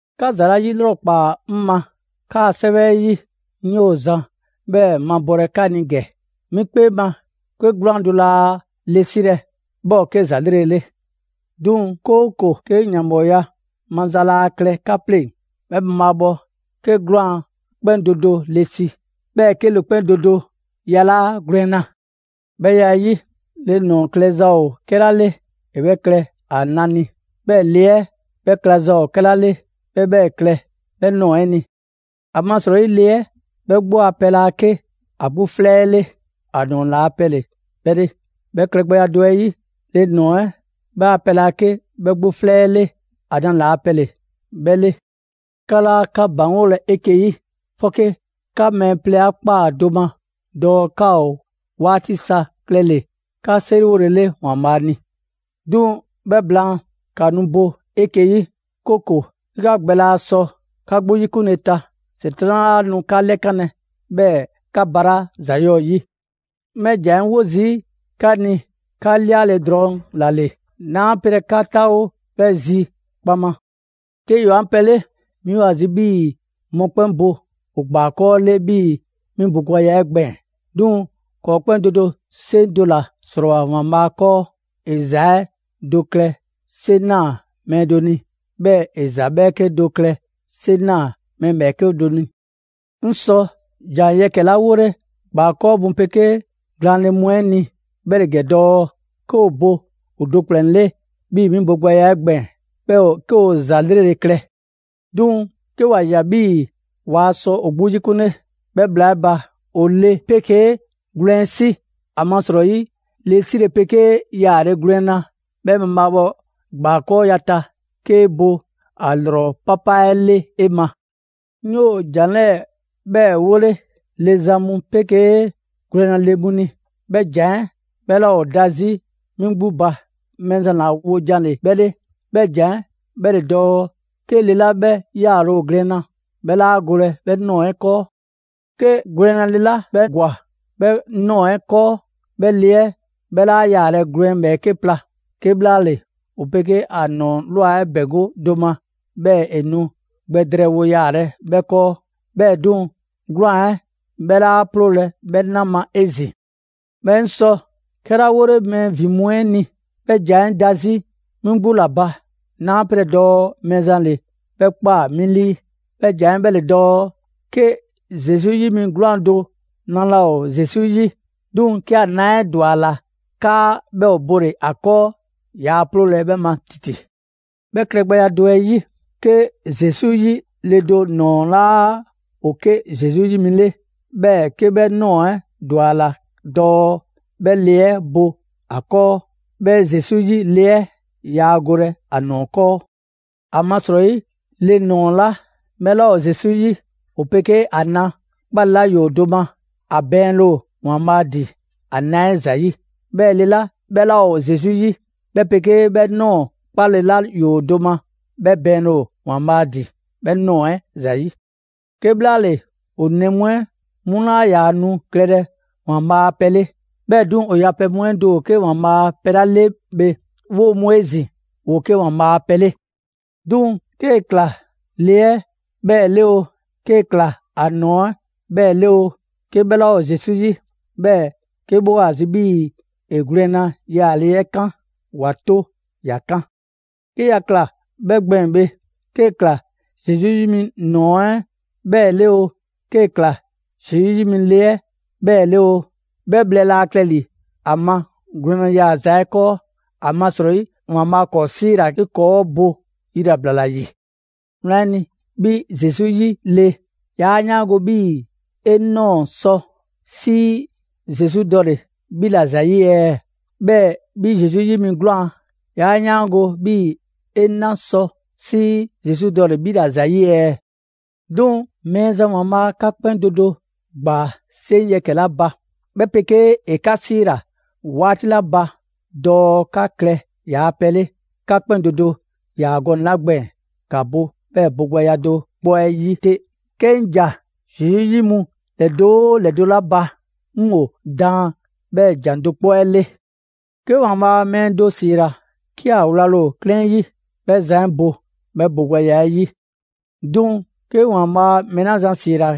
'Ka ‑za 'la 'yilrɔkpaa 'ŋ ma 'kaa‑ 'sɛwɛ 'ɛ 'yi, 'ŋ 'yoo‑ zan 'bhɛɛ‑ 'mabɔlɛ 'ka ni ‑gɛ. 'Mi 'kpee ma, 'ke 'gwlaan‑ do laa le 'silɛ‑, 'bhɛ ‑o 'ke ‑za 'lrele‑ 'le. 'Duŋ‑, 'kooko‑ 'ke ‑yanbhɔɔya maza laa klɛ 'ka 'pleŋ‑, 'bhɛ mabhaabhɔ 'ke 'gwlaan‑ 'kpɛn do do le si; 'bhɛɛ‑ 'ke le 'kpɛn do do yalaa' gwlɛnna. 'Bhɛ ya 'ɛ 'yi, le ‑nɔɔ klɛza ‑o 'kɛla 'le, ‑e 'bhɛ klɛ ‑a na ni; 'bhɛɛ‑ le 'ɛ 'bhɛ klɛza ‑o 'kɛla 'le, 'bhɛ 'bhɛ klɛ 'bhɛ ꞊nɔɔ 'ɛ ni. ‑Amasrɔyi le 'ɛ 'gbu a pɛ laa 'ke ‑a 'gbu 'flɛ 'ɛ 'le, ‑a ‑nɔɔ ‑la pɛ ‑le 'bhɛ 'le. 'Bhɛ klɛgbɛya do 'ɛ 'yi, le ‑nɔɔ 'ɛ 'bhɛ a pɛ laa 'ke 'bhɛ 'gbu 'flɛ 'ɛ 'le, ‑a na ‑laa' pɛ ‑le 'ke 'bhɛ 'le. 'Ka 'laa 'ka ‑baŋgolɛ 'eke‑ 'yi, 'fɔke 'ka mɛɛ plɛ 'a ꞊kpaa do ma dɔɔ 'ka ‑o 'waati sa klɛle‑ 'ka 'seriwole 'le ‑Waanbhaa' ni. 'Duŋ‑ 'bhɛ blaan, ‑ka nu bo 'eke‑ 'yi, 'kooko‑, 'ke 'ka gbɛ laa sɔ 'ka 'gbu 'yikunle ta, ‑Setran' 'laa nu 'ka 'lɛkanlɛ, 'bhɛɛ‑ 'ka balaa' ‑za 'yɔɔ‑ 'yi. 'Ŋ 'bhɛ ‑jan 'ɛ 'wo zii' 'ka ni 'ka 'liale‑ drɔŋ ‑la ‑le, 'naa 'pelɛ‑ 'ka 'taawo 'bhɛ zi kpaŋma. 'Ke ‑yoo 'an pɛ 'le, 'mi ‑o ‑a zi 'bhii‑ mɔkpɛn' bo ‑o ‑gbaakɔɔ' 'le 'bhii‑ 'mi bogbɛya 'ɛ gbɛɛn‑. 'Duŋ‑ ‑kɔɔ' 'kpɛn do do 'seŋ do ‑la ‑srɔɔwoa ‑Waanbhaa' 'kɔɔ: ‑e ‑za 'ɛ do klɛ 'seŋ ꞊naa mɛɛ do ni, 'bhɛɛ‑ ‑e ‑za 'bhɛɛke do klɛ 'seŋ ꞊naa mɛɛ ‑bhɛɛke' do ni. 'Ŋ sɔ ‑jan yɛkɛ‑ 'la 'wole ‑gbaakɔɔ' mu 'pegee glaanle mu 'ɛ ni 'bhɛ ‑le ‑gɛ dɔɔ: 'Ke ‑o bo ‑o do ‑kplɛn 'le 'bhii‑ 'mi bogbɛya 'ɛ gbɛɛn‑, 'bhɛ ‑o 'ke ‑za 'lrele‑ 'le. 'Duŋ‑ 'ke ‑wa ꞊ya 'bhii‑ waa sɔ ‑o 'gbu 'yikunle, 'bhɛ bhla 'ɛ ba, ‑o le 'pegee gwlɛn 'si. ‑Amasrɔyi le 'sile‑ 'pegee yaale gwlɛnna 'bhɛ mabhaabhɔ ‑gbakɔɔya ta, 'kee bo ‑a ‑lrɔ 'papa 'ɛ 'le 'e ma. 'Ŋ 'yoo zan ‑jan 'lɛɛ‑ 'bhɛɛ‑ 'wolɛ‑ le zan mu 'pegee gwlɛnna le mu ni ('bhɛ ‑jan 'ɛ 'bhɛ 'laa ‑o da 'zi 'mi 'gbu ba; Mɛɛzan ‑la wojan ‑le 'bhɛ 'le), 'bhɛ ‑jan 'ɛ 'bhɛ ‑le dɔɔ: 'Ke le 'la 'bhɛ yaale ‑o gwlɛnna, 'bhɛ 'laa golɛ 'bhɛ ꞊nɔɔ 'ɛ 'kɔɔ. 'Ke gwlɛnna le 'la 'bhɛ ‑gwa 'bhɛ ꞊nɔɔ 'ɛ 'kɔɔ, 'bhɛ le 'ɛ 'bhɛ 'laa yaalɛ gwlɛn ‑bhɛɛke' pla; 'kebhlaale, ‑o 'pegee ‑a ‑nɔɔ ‑bɛŋgo' do ma, 'bhɛɛ‑ ‑e nu gbɛ drɛɛwo yaalɛ 'bhɛ 'kɔɔ. 'Bhɛɛ‑ 'duŋ‑, 'gwlaan‑ 'ɛ 'bhɛ 'laa 'ploolɛ‑ 'bhɛ 'na ma 'ezin‑. 'Bhɛɛ‑ 'ŋ sɔ 'kɛla 'wole mɛɛ ‑vin mu 'ɛ ni ('bhɛ ‑jan 'ɛ da 'zi 'mi 'gbu ‑la ba, 'naa 'pelɛ‑ dɔɔ Mɛɛzan ‑le 'bhɛ ꞊kpaa 'mi 'lii) 'bhɛ ‑jan 'ɛ 'bhɛ ‑le dɔɔ: 'Ke Zesu 'yi mi 'gwlaan‑ do na laa ‑o Zesu 'yi, 'duŋ‑ 'ke ‑a na 'ɛ ‑dwa ‑a ‑la 'kaa 'bhɛ ‑o bole‑ ‑a 'kɔɔ, yaa 'ploolɛ‑ 'bhɛ ma ‑titi. 'Bhɛ klɛgbɛya do 'ɛ 'yi, 'ke Zesu 'yi le do ‑nɔɔ 'laa ‑o 'ke Zesu 'yi mi 'le, 'bhɛɛ‑ 'ke 'bhɛ ꞊nɔɔ 'ɛ ‑dwa ‑a ‑la dɔɔ 'bhɛ le 'ɛ bo ‑a 'kɔɔ, 'bhɛ Zesu 'yi le 'ɛ yaa golɛ ‑a ‑nɔɔ 'kɔɔ. ‑Amasrɔyi le ꞊nɔɔ 'la 'bhɛ 'laa ‑o Zesu 'yi, ‑o 'pegee ‑a na 'kpale‑ 'la ‑yoo do ma, ‑a ‑bɛɛnle' ‑o ‑Waanbhaa' ‑din ‑a na 'ɛ ‑zayi'. 'Bhɛɛ‑ le 'la 'bhɛ 'laa ‑o Zesu 'yi, 'bhɛ 'pegee 'bhɛ ꞊nɔɔ 'kpale‑ 'la ‑yoo do ma, 'bhɛ ‑bɛɛnle' ‑o ‑Waanbhaa' ‑din 'bhɛ ꞊nɔɔ 'ɛ ‑zayi'. 'Kebhlaale, ‑o ‑nɛ mu 'ɛ 'mu 'laa ‑yaa nu klɛlɛ ‑Waanbhaa' a pɛ 'le, 'bhɛɛ‑ 'duŋ‑, ‑o yapɛ mu 'ɛ do ‑o 'ke ‑Waanbhaa' a pɛ 'la 'le bhe, 'woo‑ mu 'ezin‑, ‑woo 'ke ‑Waanbhaa' a pɛ 'le. 'Duŋ‑ 'kee‑ ꞊kla le 'ɛ 'bhɛɛ‑ 'le oo, 'kee‑ ꞊kla ‑a ‑nɔɔ 'ɛ 'bhɛɛ‑ 'le oo, 'ke 'bhɛ 'laa ‑o Zesu 'yi, 'bhɛɛ‑ 'ke 'bhɛ ‑o ‑a zi 'bhii‑ ‑e gwlɛnna yaale 'ɛ 'kan, ‑wa 'to ‑ya 'kan. 'Ke ‑ya ꞊kla 'bhɛ gbɛɛn‑ bhe, 'kee‑ ꞊kla Zesu 'yi mi ‑nɔɔ 'ɛ 'bhɛɛ‑ 'le oo, 'kee‑ ꞊kla Zesu 'yi mi le 'ɛ 'bhɛɛ‑ 'le oo, 'bhɛ bhlɛ laa klɛ ‑li ‑a ma gwlɛnna yaaza 'ɛ 'kɔɔ; ‑amasrɔyi ‑Waanbhaa' ‑kɔɔ' 'siila‑ 'ke ‑kɔɔ' bo yilabla ‑la ‑yi. Wlan 'ɛ ni, 'bhi Zesu 'yi le, 'yaa 'yaango 'bhii‑ 'e ꞊nɔɔ sɔ 'sii Zesu dɔle‑ 'bhi ‑la ‑zayi' ɛɛ? 'Bhɛɛ‑ 'bhi Zesu 'yi mi 'gwlaan‑, 'yaa 'yaango‑ 'bhii‑ 'e 'na sɔ 'sii Zesu dɔle‑ 'bhi ‑la ‑zayi' ɛɛ? 'Duŋ‑, Mɛɛzan ‑Waanbhaa' 'ka 'kpɛn do do ‑gbaa 'seŋ yɛkɛ‑ 'la ba, 'bhɛ 'pegee ‑e 'ka 'siila‑ 'waati 'la ba dɔɔ 'ka klɛ ‑yaa' pɛ 'le, 'ka 'kpɛn do do ‑yaa gɔnɛ‑ 'la gbɛɛn‑, ‑ka bo 'bhɛ bogbɛya do 'kpɔ 'ɛ 'yi 'te. 'Ke 'ŋ ‑ja Zesu 'yi mu ‑lɛdo' 'oo ‑lɛdo' 'la ba, 'ŋ ‑o daan 'bhɛɛ‑ ‑jan do 'kpɔ 'ɛ 'le. 'Ke ‑Waanbhaa' mɛɛ do ‑siila 'ke ‑a wlale ‑o 'klɛɛn 'yi, 'bhɛ zan 'ɛ bo 'bhɛ bogbɛya 'ɛ 'yi. 'Duŋ‑, 'ke ‑Waanbhaa' mɛɛ 'la zan ‑siila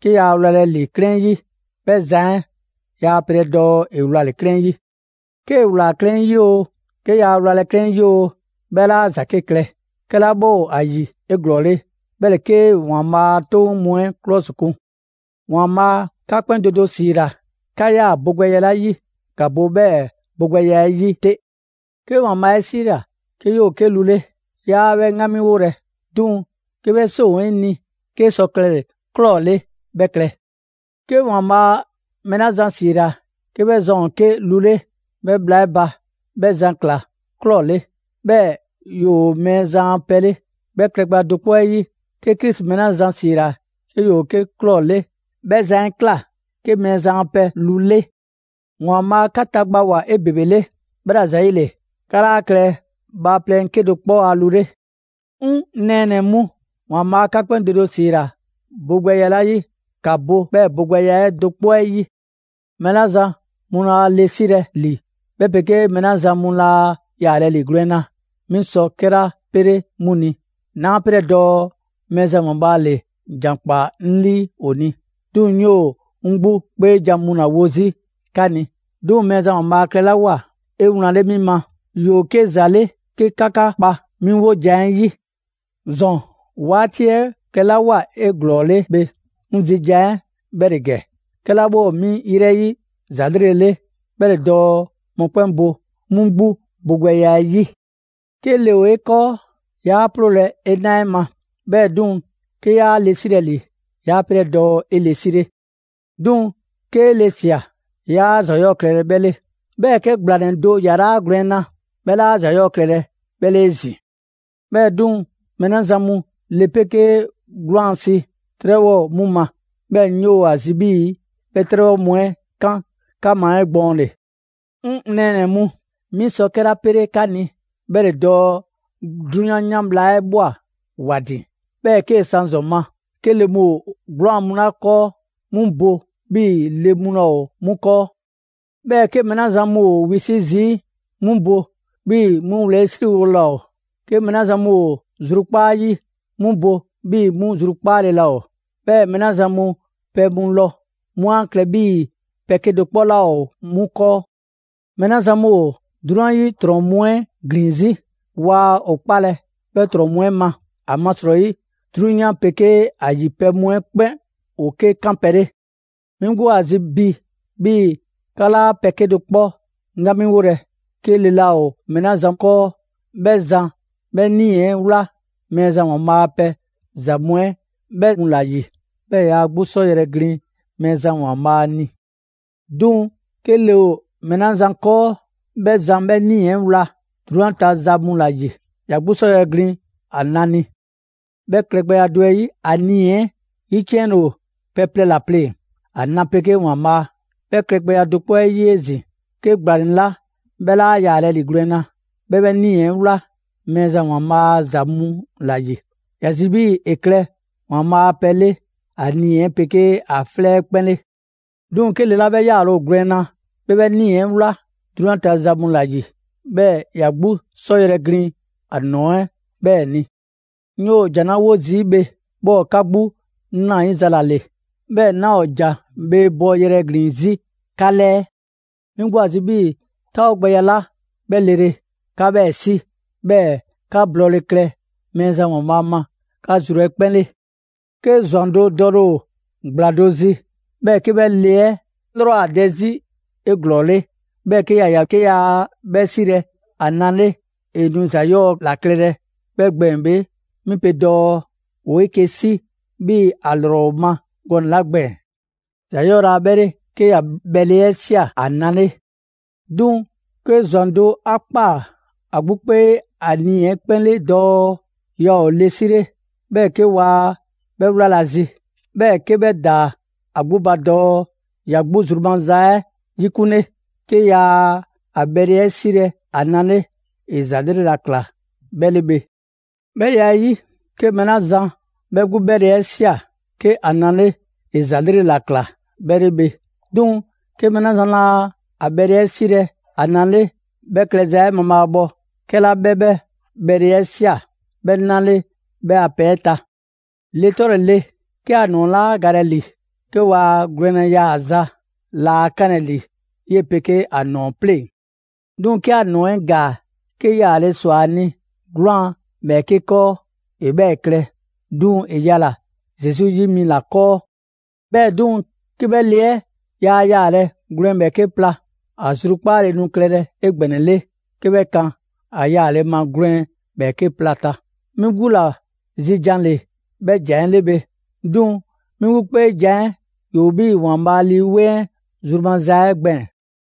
'ke yaa wlalɛ ‑li 'klɛɛn 'yi, 'bhɛ zan 'ɛ yaa pelɛ dɔɔ ‑e wlale‑ 'klɛɛn 'yi. 'Kee‑ ꞊wlaa 'klɛɛn 'yi oo, 'ke 'yaa wlalɛ 'klɛɛn 'yi oo, 'bhɛ 'laa ‑za 'ke klɛ. 'Kɛla 'bhɛ ‑o ‑a ‑yi 'eglɔɔle, 'bhɛ ‑le 'kee ‑Waanbhaa' a 'toŋ mu 'ɛ 'klɔsikun. ‑Waanbhaa' 'ka 'kpɛn do do 'siila‑ 'ka 'yaa‑ bogbɛya 'la 'yi, ‑ka bo 'bhɛɛ‑ bogbɛya 'ɛ 'yi 'te. 'Ke ‑Waanbhaa' 'e 'siila‑ 'ke 'yoo‑ 'ke lu 'le, 'yaa 'bhɛ 'ŋgamiwolɛ. 'Duŋ‑ 'ke 'bhɛ 'seŋ ‑o 'e ni 'kee sɔ klɛle‑ ꞊klɔ 'le, 'bhɛ klɛ. 'Ke Mɛɛzan mɛɛ 'la zan ‑siila 'ke 'bhɛ zan ‑o 'ke lu 'le 'bhɛ bhla 'ɛ ba, 'bhɛ zan ꞊kla ꞊klɔ 'le, 'bhɛɛ‑ ‑yoo Mɛɛzan a pɛ 'le. 'Bhɛ klɛgbɛya do 'kpɔ 'ɛ 'yi, 'ke Krisi mɛɛ 'la zan ‑siila 'ke ‑yoo 'ke ꞊klɔ 'le; 'bhɛ zan 'ɛ ꞊kla 'ke Mɛɛzan a pɛ lu 'le. ‑Waanbhaa' 'ka tagbawoa 'ebebele, 'bhɛla‑ ‑zayile, 'ka 'laa klɛlɛ bhaaplɛŋ 'kedo‑ 'kpɔ a lu 'le. 'Ŋ nɛɛnɛ‑ mu, ‑Waanbhaa' 'ka 'kpɛn do do ‑siila bogbɛya 'la 'yi, ‑ka bo 'bhɛɛ‑ bogbɛya 'ɛ do 'kpɔ 'ɛ 'yi. Mɛɛ 'la zan mu laa le 'silɛ‑ ‑li 'bhɛ 'pegee mɛɛ 'la zan mu laa yaalɛ ‑li gwlɛnna, 'mi sɔ 'kɛla 'pele 'mu ni, 'naa 'pelɛ‑ dɔɔ Mɛɛzan ‑Waanbhaa' ‑le ‑jan ‑kpaa 'ŋ 'lii ‑o ni; 'duŋ‑ 'ŋ 'yoo‑ 'ŋ 'gbu 'kpeejan‑ ‑la wo 'zi 'ka ni. 'Duŋ‑ Mɛɛzan ‑Waanbhaa' klɛlawoa 'ewlanle 'mi ma, ‑yoo 'ke ‑za 'le 'ke 'ka 'ka kpa 'mi 'wojan‑ 'ɛ 'yi. ‑Zɔn 'waati 'ɛ klɛlawoa 'eglɔɔle bhe, 'ŋ zi jan 'ɛ 'bhɛ ‑le ‑gɛ: 'kɛla 'bhɛ ‑o 'mi 'yrɛ 'yi ‑za 'lrele‑ 'le 'bhɛ ‑le dɔɔ mɔkpɛn' bo 'mu 'gbu bogbɛya 'ɛ 'yi. 'Ke le ‑o 'e 'kɔɔ, 'yaa 'ploolɛ‑ 'e 'na 'ɛ ma. 'Bhɛɛ‑ 'duŋ‑, 'ke 'yaa le 'silɛ‑ ‑li, 'yaa 'pelɛ‑ dɔɔ 'e le 'sile. 'Duŋ‑ 'kee le ꞊sia, 'yaa ‑za 'yɔɔ‑ klɛlɛ 'bhɛ 'le. 'Bhɛɛ‑ 'ke ‑gblanɛ do yalaa' gwlɛnna, 'bhɛ 'laa ‑za 'yɔɔ‑ klɛlɛ 'bhɛ 'le 'ezin‑. 'Bhɛɛ‑ 'duŋ‑, mɛɛ 'la zan mu le 'pegee gwlɛn si, 'trɛbhɔ ‑o 'mu ma. 'Bhɛɛ‑ 'ŋ 'yoo ‑a zi 'bhii‑ 'bhɛ 'trɛbhɔ mu 'ɛ 'kan 'ka ma 'egbɔɔnle. 'Ŋ nɛɛnɛ‑ mu, 'mi sɔ 'kɛla 'pele 'ka ni, 'bhɛ ‑le dɔɔ 'drunyan 'yan bhla 'ɛ ꞊bhwa ‑wa ‑din. 'Bhɛɛ‑ 'kee‑ san ‑zɔn ma, 'ke le mu ‑o 'gwlaan‑ mu 'la 'kɔɔ, 'mu bo 'bhii‑ le laa ‑o 'mu 'kɔɔ. 'Bhɛɛ‑ 'ke mɛɛ 'la zan mu ‑o wisi' zii', 'mu bo 'bhii‑ 'mu wlɛyisriwole laa ‑o. 'Ke mɛɛ 'la zan mu ‑o zrukpaa' 'yi, 'mu bo 'bhii‑ 'mu zrukpaale laa ‑o. 'Bhɛɛ‑ mɛɛ 'la zan mu pɛ mu lɔ, 'mu 'a klɛ 'bhii‑ pɛ 'kedo‑ 'kpɔ 'laa ‑o 'mu 'kɔɔ. Mɛɛ 'la zan mu ‑o 'drunyan 'yi ‑trɔn mu 'ɛ ‑glin 'zi, waa ‑o 'kpalɛ‑ 'bhɛ ‑trɔn mu 'ɛ ma. ‑Amasrɔyi 'drunyan 'pegee ‑a ‑yi pɛ mu 'ɛ 'kpɛn ‑o 'ke 'kanpɛ‑ 'le. 'Mi 'gbu ‑o ‑a zi bi 'bhii‑ 'ka 'laa pɛ 'kedo‑ 'kpɔ 'ŋgamiwolɛ. 'Ke le laa ‑o mɛɛ 'la zan 'kɔɔ, 'bhɛ zan 'bhɛ 'nii‑ 'ɛ 'wla Mɛɛzan ‑Waanbhaa' a pɛ ‑za mu 'ɛ 'bhɛ mu ‑la ‑yi; 'bhɛɛ‑ ‑ya 'gbu 'sɔ yrɛ glin Mɛɛzan ‑Waanbhaa' ni. 'Duŋ‑ 'ke le ‑o mɛɛ 'la zan 'kɔɔ, 'bhɛ zan 'bhɛ 'nii‑ 'ɛ wla 'drunyan ta za mu ‑la ‑yi. ‑Ya 'gbu 'sɔ yrɛ glin ‑a na ni. 'Bhɛ klɛgbɛya 'ɛ 'yi, ‑a nii‑ 'ɛ 'yiciɛnle ‑o pɛ plɛ ‑la pleŋ‑: ‑a na 'pegee ‑Waanbhaa'. 'Bhɛ klɛgbɛya do 'kpɔ 'ɛ 'yi 'ezin‑, 'ke ‑gblanɛ 'la 'bhɛ 'laa yaalɛ ‑li gwlɛnna, 'bhɛ 'bhɛ 'nii‑ 'ɛ wla Mɛɛzan ‑Waanbhaa' a ‑za mu ‑la ‑yi. ‑Ya zi 'bhii‑ ‑e klɛ ‑Waanbhaa' a pɛ 'le ‑a nii‑ 'pegee ‑a 'flɛ 'ɛ 'kpɛn 'le. 'Duŋ‑, 'ke le 'la 'bhɛ 'yaale‑ ‑o gwlɛnna, 'bhɛ 'bhɛ 'nii‑ 'ɛ wla 'drunyan ta za mu ‑la ‑yi; 'bhɛɛ‑ ‑ya 'gbu 'sɔ yrɛ glin ‑a ‑nɔɔ 'ɛ 'bhɛɛ‑ ni. 'Ŋ 'yoo‑ ‑jan 'la 'wo zii' bhe, 'bhɛ ‑o 'ka 'gbu 'nrayiza ‑la ‑le, 'duŋ‑ 'naa‑ ‑o ‑jan bhee bɔ yrɛ ‑glin 'zi 'ka 'lɛɛ. 'Mi 'gbu ‑o ‑a zi 'bhii‑ 'taawogbɛya 'la 'bhɛ lele, 'ka 'bhɛɛ‑ 'si, 'bhɛɛ‑ 'ka blɔɔle klɛ Mɛɛzan ‑Waanbhaa' ma 'ka zru 'ɛ 'kpɛn 'le. 'Ke ꞊zwan do dɔle ‑o ‑gbla do zi, 'bhɛɛ‑ 'ke 'bhɛ le 'ɛ 'lrɔ ‑o dɛ 'zi 'eglɔɔle; 'bhɛɛ‑ 'ke ‑ya ꞊ya 'ke yaa 'bhɛ 'silɛ‑ ‑a na 'le, ‑e nu ‑za 'yɔɔ‑ ‑la klɛlɛ 'bhɛ gbɛɛn‑ bhe, 'mi pe dɔɔ ‑woo 'eke‑ 'si 'bhii‑ ‑a ‑lrɔ ‑o ‑a ma gɔnɛ‑ 'la gbɛɛn‑. ‑Za 'yɔɔ‑ laa 'bhɛ 'le 'ke ‑ya bhɛle 'ɛ ꞊sia ‑a na 'le. 'Duŋ‑, 'ke ꞊zwan do 'a ꞊kpaa ‑a 'gbu 'kpee ‑a nii‑ 'ɛ 'kpɛn 'le dɔɔ yaa ‑o le 'sile, 'bhɛɛ‑ 'ke waa 'bhɛ 'wlalɛ‑ ‑a zi, 'bhɛɛ‑ 'ke 'bhɛ ‑daa ‑a 'gbu ba dɔɔ ‑ya 'gbu zru maza 'ɛ 'yikunle. 'Ke 'yaa‑ ‑a bhɛle 'ɛ 'silɛ‑ ‑a na 'le; ‑e ‑za 'lrele‑ ‑la ‑kla 'bhɛ 'le bhe. 'Bhɛ ya 'ɛ 'yi, 'ke mɛɛ 'la zan 'bhɛ 'gbu 'bhɛle‑ 'ɛ ꞊sia 'ke ‑a na 'le, ‑e ‑za 'lrele‑ ‑la ꞊kla 'bhɛ 'le bhe. 'Duŋ‑ 'ke mɛɛ 'la zan laa ‑a 'bhɛle‑ 'ɛ 'silɛ‑ ‑a na 'le, 'bhɛ klɛza 'ɛ mabhaabhɔ 'kɛla 'bhɛ 'bhɛ 'bhɛle‑ 'ɛ ꞊sia 'bhɛ 'na 'le 'bhɛ a pɛ 'ɛ ta. Le 'tɔle‑ le, 'ke ‑a ‑nɔɔ 'laa galɛ ‑li, 'ke ‑waa' gwlɛnna yaaza laa 'kanlɛ‑ ‑li 'yee‑ 'pegee ‑a ‑nɔɔ 'pleŋ‑. 'Duŋ‑ 'ke ‑a ‑nɔɔ 'ɛ ‑gaa, 'ke yaale ‑swa ‑a ni 'gwlaan‑ ‑bhɛɛke' 'kɔɔ, ‑e 'bhɛɛ‑ klɛ; 'duŋ‑ ‑e yala‑ Zesu 'yi mi ‑la 'kɔɔ. 'Bhɛɛ‑ 'duŋ‑, 'ke 'bhɛ le 'ɛ yaa yaalɛ gwlɛn ‑bhɛɛke' pla, ‑a zrukpaale nu klɛlɛ 'egbɛnɛle 'ke 'bhɛ kan ‑a yaale ma gwlɛn ‑bhɛɛke' pla ta. 'Mi 'gbu ‑la zi jan ‑le 'bhɛ ‑jan 'ɛ 'le bhe; 'duŋ‑ 'mi 'gbu 'kpeejan‑ 'ɛ ‑yoo 'bhii‑ ‑Waanbhaa' Lii 'Weŋ 'ɛ zru maza 'ɛ gbɛɛn‑.